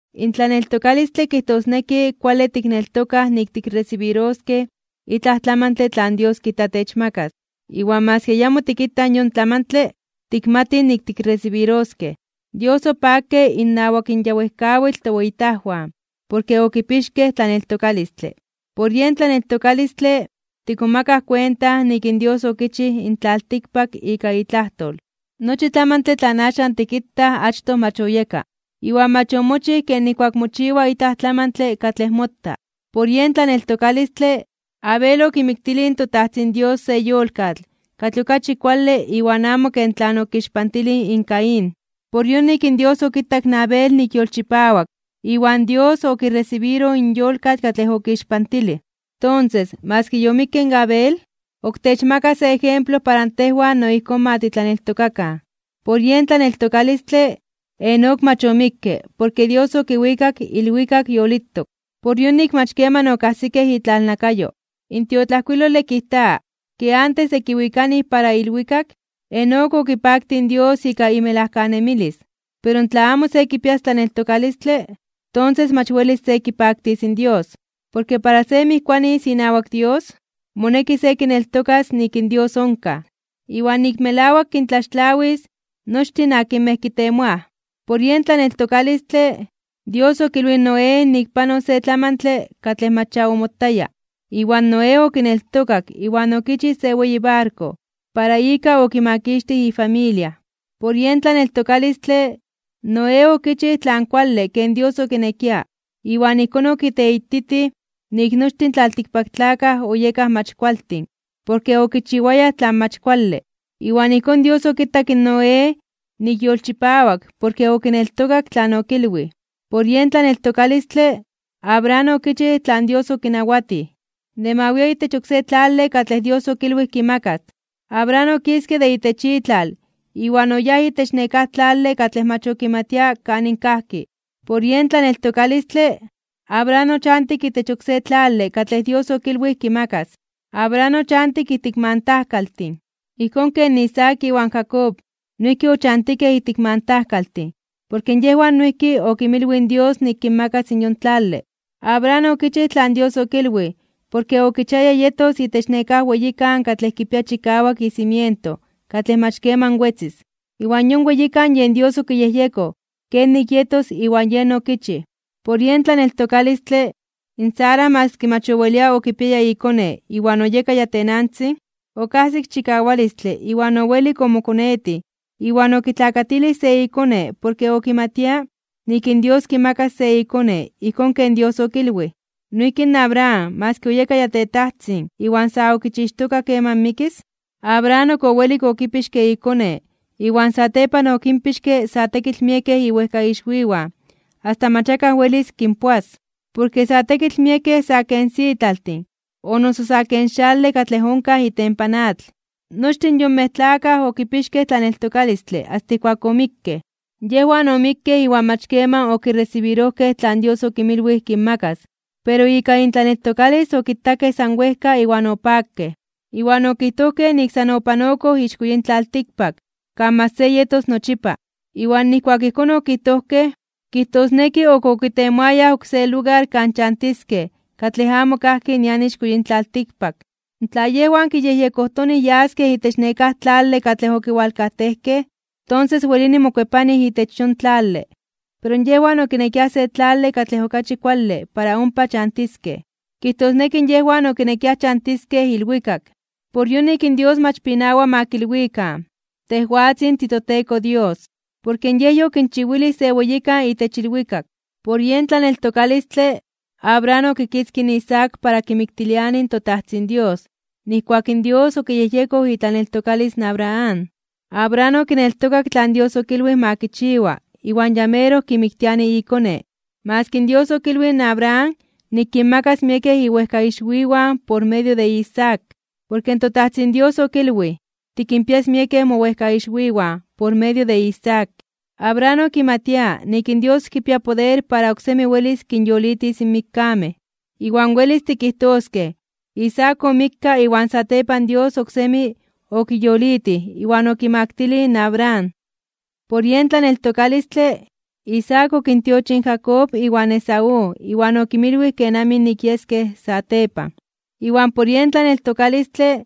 In tlaneltokalistle kijtosneki kuale tikneltokaj nik tikresibiroskej itlaj tlamantle tlan Dios kijta techmakas. Iwan maski ayamo tikitaj in yon tlamantle, tikmatij nik tikresibiroskej. Dios opakke innawak in ya wejkawitl toweyitajwan, porke okipixkej tlaneltokalistle. Por yen tlaneltokalistle, tikmomakaj kuenta nik in Dios okichij in tlaltikpak ika itlajtol. Nochi tlamantle tlan axan tikitaj achtoj mach oyeka, iwan mach omochij ken nijkuak mochiwa itlaj tlamantle katlej mota. Por yen tlaneltokalistle, Abel okimiktilij in toTajtzin Dios se yolkatl katlej okachi kuale iwan amo ken tlan okixpantilij in Caín. Por yonik in Dios okitak in Abel nik yolchipawak iwan Dios okiresibiroj in yolkatl katlej okixpantilij. Tonses, maski yomikke in Abel, ok techmaka se ejemplo para tejwan no ijkón ma titlaneltokakan. Por yen tlaneltokalistle, Enoc mach omikke porke Dios okiwikak ilwikak yolitok. Por yonik mach keman okajsikej itlalnakayo. In tiotlajkuilole kijta ke antes de kiwikanij para ilwikak, Enoc okipaktij in Dios ika imelajkanemilis. Pero tla amo se kipias tlaneltokalistle, tonses mach welis se kipaktis in Dios. Porke para se mijkuanis inawak Dios, moneki se kineltokas nik in Dios onkaj, iwan nik melawak kintlaxtlawis nochtin akinmej kitemoaj. Por yen tlaneltokalistle, Dios okilwij in Noé nik panos se tlamantle katlej mach ya omotaya, iwan Noé okineltokak iwan okichij se weyi barko para ika okimakixtij ifamilia. Por yen tlaneltokalistle, Noé okichij tlan kuale ken Dios okinekia iwan ijkón okiteititij nik nochtin in tlaltikpaktlakaj oyekaj mach kualtin porke okichiwayaj tlan mach kuale, iwan ijkón Dios okitak in Noé nik yolchipawak porke okineltokak tlan okilwij. Por yen tlaneltokalistle, Abraham okichij tlan Dios okinawatij, de ma wia itech oksé tlale katlej Dios okilwij kimakas. Abraham okiske de itech itlal iwan oyáj itech nekáj tlale katlej mach okimatia kanin kajki. Por yen tlaneltokalistle, Abraham ochantik itech oksé tlale katlej Dios okilwij kimakas. Abraham ochantik ijtik mantajkaltin, ijkón ken Isaac iwan Jacob noijki ochantikej ijtik mantajkaltin porke yejwan noijki okinmilwij in Dios nik kinmakas in yon tlale. Abraham okichij tlan Dios okilwij porke okichiaya yetos itech nekáj weyikan katlej kipia chikawak icimiento katlej mach keman wetzis. Iwan yon weyikan yen Dios okiyejyekoj kenik yetos iwan yen okichij. Por yen tlaneltokalistle, in Sara maski mach owelia okipiaya ikone iwan oyeka ya tenantzin, okajsik chikawalistle iwan owelik omokonetij iwan okitlakatilij se ikone porke okimatia nik in Dios kimakas se ikone ijkón ken Dios okilwij. Noijki in Abraham maski oyeka ya tetajtzin iwan sa okichixtoka keman mikis, Abraham ok owelik okipixke ikone iwan satepan okinpixke sa tekitl miekej iwejkaixwiwan asta mach akaj welis kinpoas, porke sa tekitl miekej sa ken sitlaltin o noso sa ken xale katlej onkaj itempan atl. Nochtin yonmej tlakaj okipixkej tlaneltokalistle asta ijkuak omikkej. Yejwan omikkej iwan mach keman okiresibirojkej tlan Dios okinmilwij kinmakas, pero ika intlaneltokalis okitakej san wejka iwan opakej. Iwan okijtojkej nik san opanokoj ixko yin tlaltikpak kan mach se yetos nochipa. Iwan nijkuak ijkón okijtojkej, kijtosneki ok okitemoayaj oksé lugar kan chantiskej katlej amo kajki nian ixko yin tlaltikpak. Tla yejwan kiyejyekojtonij yaskej itech nekáj tlale katlej okiwalkajtejkej, tonses welini mokuepanij itech yon tlale. Pero yejwan okinekiaj se tlale katlej okachi kuale para ompa chantiskej, kijtosneki yejwan okinekiaj chantiskej ilwikak. Por yonik in Dios mach pinawa de ma kinotzakan nik yen Dios de yejwan. Porke Yej yokinchiwilij se weyikan itech ilwikak. Por yen tlaneltokalistle, Abraham okitzkij in Isaac para kimiktiliani in toTajtzin Dios nijkuak in Dios okiyejyekoj itlaneltokalis in Abraham. Abraham okineltokak tlan Dios okilwij ma kichiwa iwan ya meroj kimiktiani ikone, maski Dios okilwij in Abraham nik kinmakas miekej iwejkaixwiwan por medio de Isaac. Porke in toTajtzin Dios okilwij: “Tikinpias miekej mowejkaixwiwan por medio de Isaac.” Abraham okimatia nik in Dios kipia poder para oksemi welis kinyolitis in mikkamej. Iwan welis tikijtoskej Isaac omikka iwan satepan Dios oksemi okiyolitij iwan okimaktilij in Abraham. Por yen tlaneltokalistle, Isaac okintiochij in Jacob iwan Esaú iwan okinmilwij kenamij nik yeskej satepan. Iwan por yen tlaneltokalistle,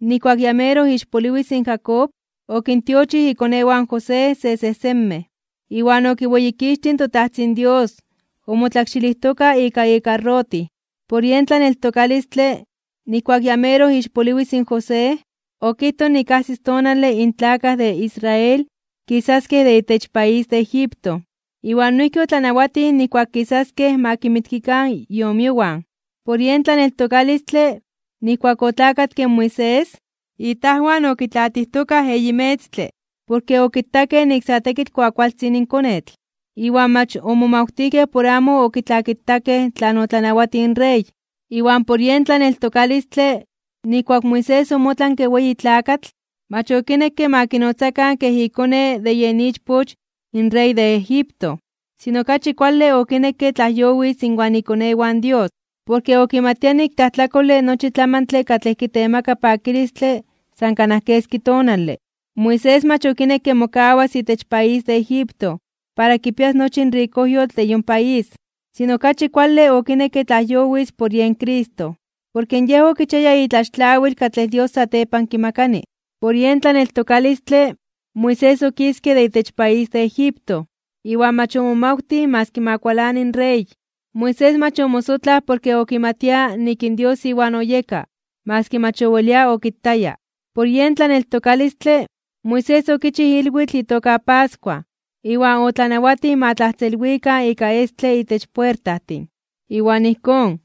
nijkuak ya meroj ixpoliwis in Jacob, okintiochij ikonewan José sesejsenmej, iwan okiweyikixtij in toTajtzin Dios omotlakxilijtoka ika ikarrotij. Por yen tlaneltokalistle, nijkuak ya meroj ixpoliwis in José, okijtoj nik ajsis tonale in tlakaj de Israel kisaskej de itech país de Egipto, iwan noijki otlanawatij nijkuak kisaskej ma kinmitkikan iomiowan. Por yen tlaneltokalistle, nijkuak otlakatke in Moisés, itajwan okitlaatijtokaj eyi metztle. Porke okitakej nik sa tekitl kuakualtzin konetl, iwan mach omomawtijkej por amo okitlakitakej tlan otlanawatij in rey. Iwan por yen tlaneltokalistle, nijkuak Moisés omotlanke weyi tlakatl, mach okinekke ma kinotzakan kej ikone de yen ichpoch in rey de Egipto. Sino okachi kuale okinekke tlajyowis inwan ikonewan Dios, porke okimatia nik tlajtlakole nochi tlamantle katlej kitemaka pakilistle san kanaj keski tonale. Moisés mach okinekke mokawas itech país de Egipto para kipias nochi in rikojyotl de yon país, sino okachi kuale okinekke tlajyowis por yen Cristo, porke yej okichiaya itlaxtlawil katlej Dios satepan kimakani. Por yen tlaneltokalistle, Moisés okiske de itech país de Egipto, iwan mach omomawtij maski ma kualani in rey. Moisés mach omosotlaj porke okimatia nik in Dios iwan oyeka maski mach owelia okitaya. Por yen tlaneltokalistle, Moisés okichij ilwitl itoka pascua iwan otlanawatij ma tlajtzelwikan ika estle itech puertajtin. Iwan ijkón,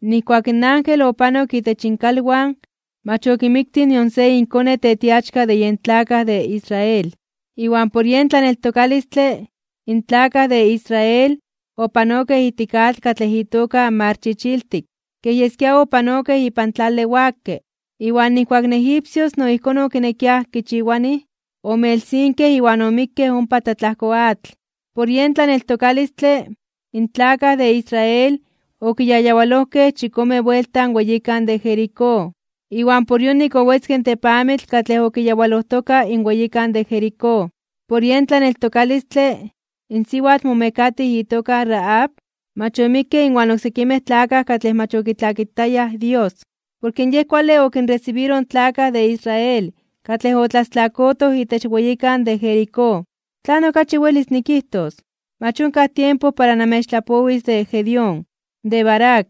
nijkuak in ángel opanok itech inkalwan mach okimiktij nion se inkone tetiachka de yen tlakaj de Israel. Iwan por yen tlaneltokalistle, in tlakaj de Israel opanokej ijtik atl katlej itoka Mar Chichiltik, kej yeskia opanokej ipan tlale wakke. Iwan nijkuak in egipcios no ijkón okinekiaj kichiwanij, omelsinkej iwan omikkej ompa tlatlajko atl. Por yen tlaneltokalistle, in tlakaj de Israel okiyayawalojkej chikome buelta in weyikan de Jericó, iwan por yonik owetzke in tepamitl katlej okiyawalojtoka in weyikan de Jericó. Por yen tlaneltokalistle, in siwatl momekatij itoka Rahab, mach omikke inwan oksekimej tlakaj katlej mach okitlakitayaj Dios, porke yej kuale okinresibiroj in tlakaj de Israel katlej otlastlakotoj itech weyikan de Jericó. ¿Tlan okachi welis nikijtos? Mach onkaj tiempo para namechtlapowis de Gedeón, de Barac,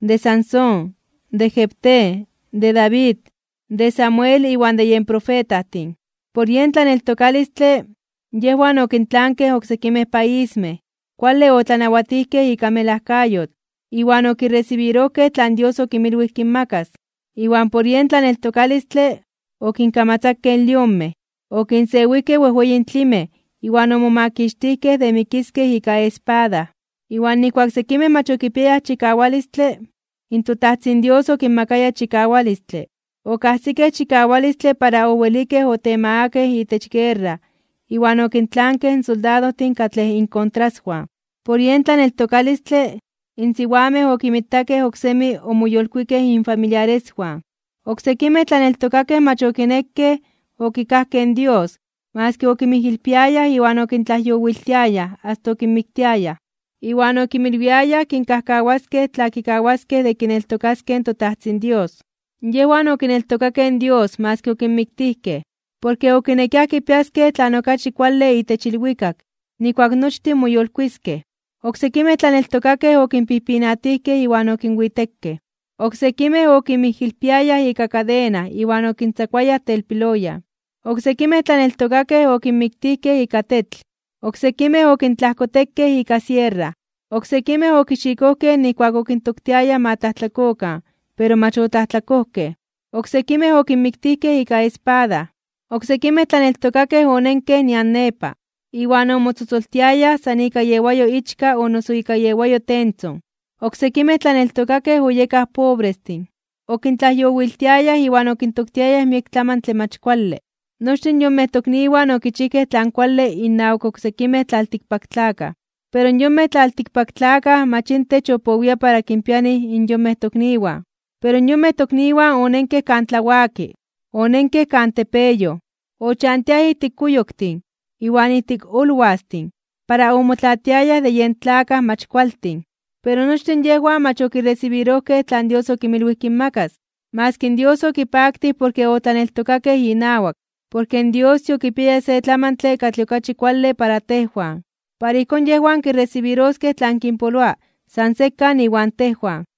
de Sansón, de Jefté, de David, de Samuel iwan de yen profetajtin. Por yen tlaneltokalistle, yejwan okintlankej oksekimej paismej, kuale otlanawatijkej ika melajkayotl, iwan okiresibirojkej tlan Dios okinmilwij kinmakas. Iwan por yen tlaneltokalistle, okinkamatzakej lionmej, okinsewijkej wejweyin tlimej iwan omomakixtijkej de mikiskej ika espada. Iwan nijkuak sekimej mach okipiayaj chikawalistle, in toTajtzin Dios okinmakaya chikawalistle. Okajsikej chikawalistle para owelikej otemagakej (okinmakakej) itech guerra iwan okintlankej in soldadojtin katlej inkontraswan. Por yen tlaneltokalistle, in siwamej okinmitakej oksemi omoyolkuikej infamiliareswan. Oksekimej tlaneltokakej mach okinekej okikajkej in Dios maski okinmijilpiayaj iwan okintlajyowiltiayaj asta okinmiktiayaj, iwan okinmilwiayaj kinkajkawaskej tla kikawaskej de kineltokaskej in toTajtzin Dios. Yejwan okineltokakej in Dios maski okinmiktijkej, porke okinekiaj kipiaskej tlan okachi kuale itech ilwikak nijkuak nochtin moyolkuiskej (moyolitiskej). Oksekimej tlaneltokakej okinpijpinatijkej iwan okinwitekej. Oksekimej okinmijilpiayaj ika kadena iwan okintzakuayaj telpiloyan. Oksekimej tlaneltokakej okinmiktijkej ika tetl. Oksekimej okintlajkotekej ika sierra. Oksekimej okixikojkej nijkuak okintoktiayaj ma tlajtlakokan pero mach otlajtlakojkej. Oksekimej okinmiktijkej ika espada. Oksekimej tlaneltokakej onenkej nian nepa, iwan omotzotzoltiayaj san ika iewayo ichka o noso ika iewayo tentzon. Oksekimej tlaneltokakej oyekaj pobrestin, okintlajyowiltiayaj iwan okintoktiayaj miek tlamantle mach kuale. Nochtin yonmej tokniwan okichijkej tlan kuale innawak oksekimej tlaltikpaktlakaj, pero yonmej tlaltikpaktlakaj mach intech opowia para kinpianij in yonmej tokniwan. Pero yonmej tokniwan onenkej kan tlawaki, onenkej kan tepeyoj, ochantiaj ijtik kuyoktin iwan ijtik olwastin para omotlaatiayaj de yen tlakaj mach kualtin. Pero nochtin yejwan mach okiresibirojkej tlan Dios okinmilwij kinmakas, maski in Dios okipaktij porke otlaneltokakej inawak. Porke Dios yokipiaya se tlamantle katlej okachi kuale para tejwan. Para ijkón yejwan kiresibiroskej tlan kinpoloa san sekan iwan tejwan.